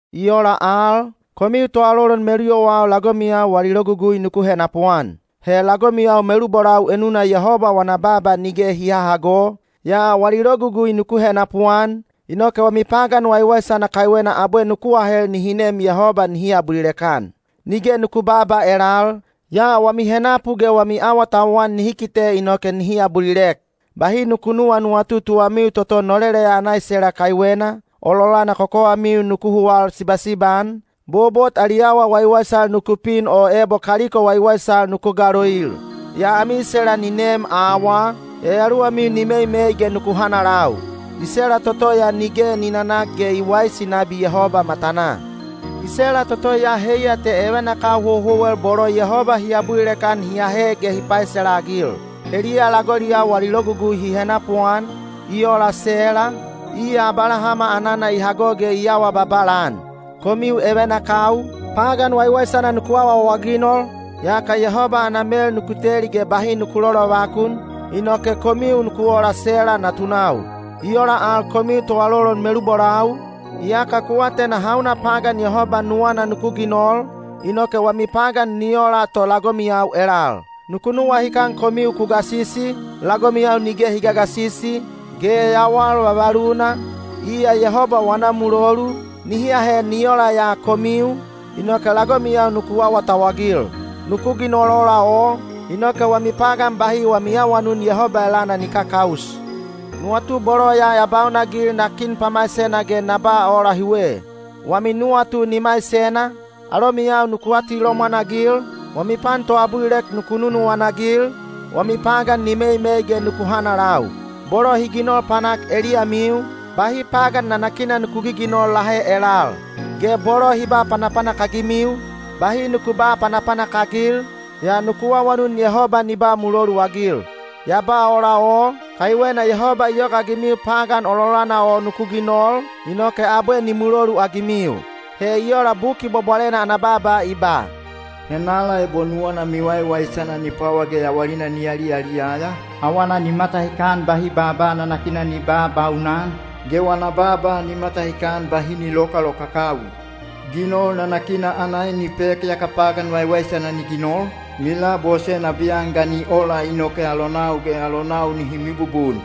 I ola al, komiu toalolon meluyowau lagomiyau wali logugui nuku henapuan. He lagomiyau melubolau enuna Yehoba wana baaba nige hi hahago, yaa wali logugui nuku henapuan, inoke wami pagan waiwaisana kaiwena abwe nuku ahel nihi nem Yehoba nihi abulilek-an. Nige nuku babaa elal, yaa wami henapu ge wami awatauwan nihi kite inoke nihi abulilek. Bahi nuku nuwanuwatu tuwamiu toto noleleya ana isela kaiwena, ololana kokowamiu nuku huwal sibasiba-an, bobot ali awa waiwaisal nuku pin o ebo kaliko waiwaisal nuku galoil. Yaa ami isela ni neem awaa, yayaluwamiu ni meimei ge nuku hanalau. Isela toto ya nige ni nanak ge i waisi nabi Yehoba matanaa. Isela toto ya heiya te evenakau houhouwel bolo Yehoba hi abulilek-an hi ahe ge hi paisela-agil. Heliya lagoliyau wali logugui hi henapuan, i ola Sela, iya Abalahama anana i hago ge i awa babala-an. Komiu evenakau, pagan waiwaisana nuku awaawaginol, yaka Yehoba ana mel nuku teli ge bahi lolovakun, inoke komiu nuku ola Sela natunau. I ola al komiu toalolon melubolau, iyaka ku atena hauna pagan Yehoba nuwana nuku ginol, inoke wami pagan ni ola to lagomiyau elal. Nuku nuwahikan komiu ku gasisi, lagomiyau nige hi gagasisi, ge yawal vavaluna, iya Yehoba wana mulolu, nihi ahe ni ola ya komiu, inoke lagomiyau nuku awatauwagil. Nuku ginol ola o, inoke wami pagan bahi wami awanun Yehoba elana ni kakaus. Nuwatu bolo ya baunanagil na kin pamaisena ge na ba ola hiwe: wami nuwatu ni maisena, alomiyau nuku atilomwan-agil, wami pan toabulilek nuku nunuwana-agil, wami pagan ni meimei ge nuku hanalau. Bolo hi ginol panak eliyamiu, bahi pagan nanakina nuku giginol lahe elal; ge bolo hi ba panapanak-agimiu, bahi nuku ba panapanak-agil, yaa nuku awanun Yehoba ni ba muloluagil. Ya ba ola o, kaiwena Yehoba i yogaagimiu pagan ololana o nuku ginol, inoke abwe ni muloluagimiu. He i ola Buki Bwabwalena ana baaba i ba: Henala ebo nuwana miwaiwaisana ni pwawa ge yawalina ni yaliyaliyaya, awana ni matahikan bahi baaba nanakina ni babaunan, ge wana baaba ni matahikan bahi ni lokalokakawi. Ginol nanakina ana en ni pek yaka pagan waiwaisana ni ginol, ni labose nabiyan ga ni ola inoke alonau ge alonau nihi mibubun.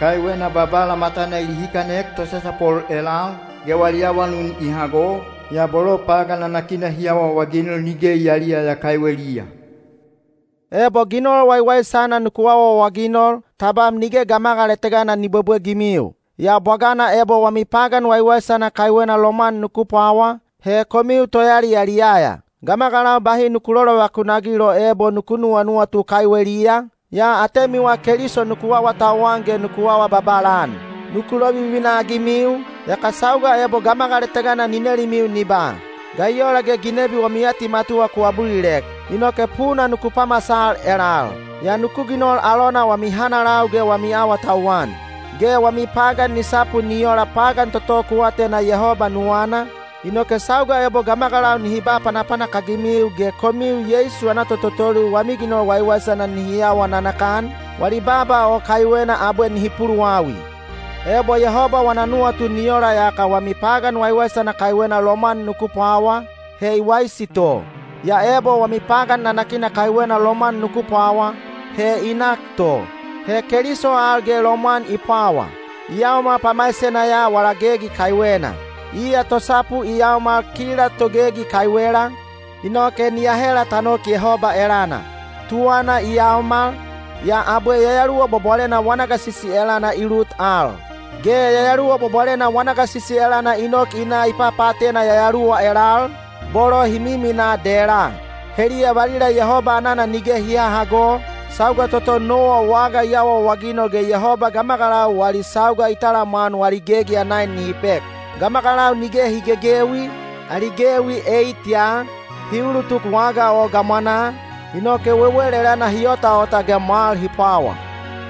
Kaiwena Babala matana i lihikanek tosasapol elal, ge wali awanun i hago, yaa bolo pagan nanakina hi awaawaginol nige i yaliyaya kaiweliya. Ebo ginol waiwaisana nuku awaawaginol, tabam nige gamagal etega ni bwebwegimiu. Yaa bwagana ebo wami pagan waiwaisana kaiwena lomwan nuku pwawa, he komiu toyaliyaliyaya. Gamagalau bahi nuku lolovakun-agil o ebo nuku nuwanuwatu kaiweliya, yaa atemiwa Keliso nuku awatauwan ge nuku awa babala-an. Nuku lovivina-agimiu, yaka sauga ebo gamagal etega ni nelimiu ni ba, “Ga i ola ge ginebi wami atimatuwa ku abulilek?” inoke puna nuku pamasal elal. Yaa nuku ginol alona wami hanalau ge wami awatauwan. Ge wami pagan ni sapu ni ola pagan toto ku atena Yehoba nuwana, inoke sauga ebo gamagalau nihi ba panapanak-agimiu ge komiu Yeisu ana tototoulil wami ginol waiwaisana nihi awa nanakan, wali baaba o kaiwena abwe nihi puluwawi. Ebo Yehoba wana nuwatu ni ola yaka wami pagan waiwaisana kaiwena lomwan nuku pwawa, he i waisi to. Yaa ebo wami pagan nanakina kaiwena lomwan nuku pwawa, he i nak to. He Keliso al ge lomwan i pwawa: i yaomal pamaisena ya wala gegi kaiwena. Iya tosapu i yaomal kila togegi kaiwela, inoke ni ahela ta nok Yehoba elana. Tuwana i yaomal, yaa abwe Yayaluwa Bwabwalena wana gasisi elana i lut al. Ge Yayaluwa Bwabwalena wana gasisi elana i nok i na i papaatena yayaluwa elal, bolo hi miminaa dela. Heliya valila Yehoba anana nige hi hahago, sauga toto Nowa waga i awaawaginol ge Yehoba gamagalau wali sauga i talamwan wali gegi ana en nihi pek. Gamagalau nige hi gegewi, ali gewi eit ya, hi ulutuk waga o gamwanaa, inoke wewel elana hi otaota ge mwal hi pwawa.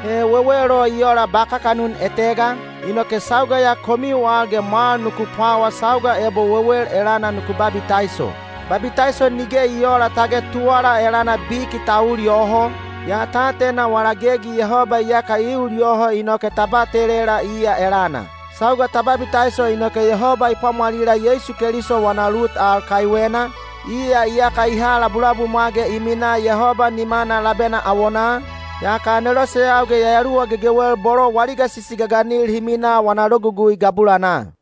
He wewel o i ola ba kakanun etega, inoke sauga ya komiu al ge mwal nuku pwawa sauga ebo wewel elana nuku babitaiso. Babitaiso nige i oola tage tuwala elana biki ta ul yoho, yaa ta atena wala gegi Yehoba iyaka i ul yoho inoke ta batelela iya elana. Sauga ta babitaiso inoke Yehoba i pwamwalila Yeisu Keliso wana lut al kaiwena, iya iyaka i ha labulabumwa ge i minaa Yehoba nimana labena awonaa, yaka aneloseyau ge yayaluwa gegewel bolo wali gasisi gaganil hi minaa wana logugui gabulanaa.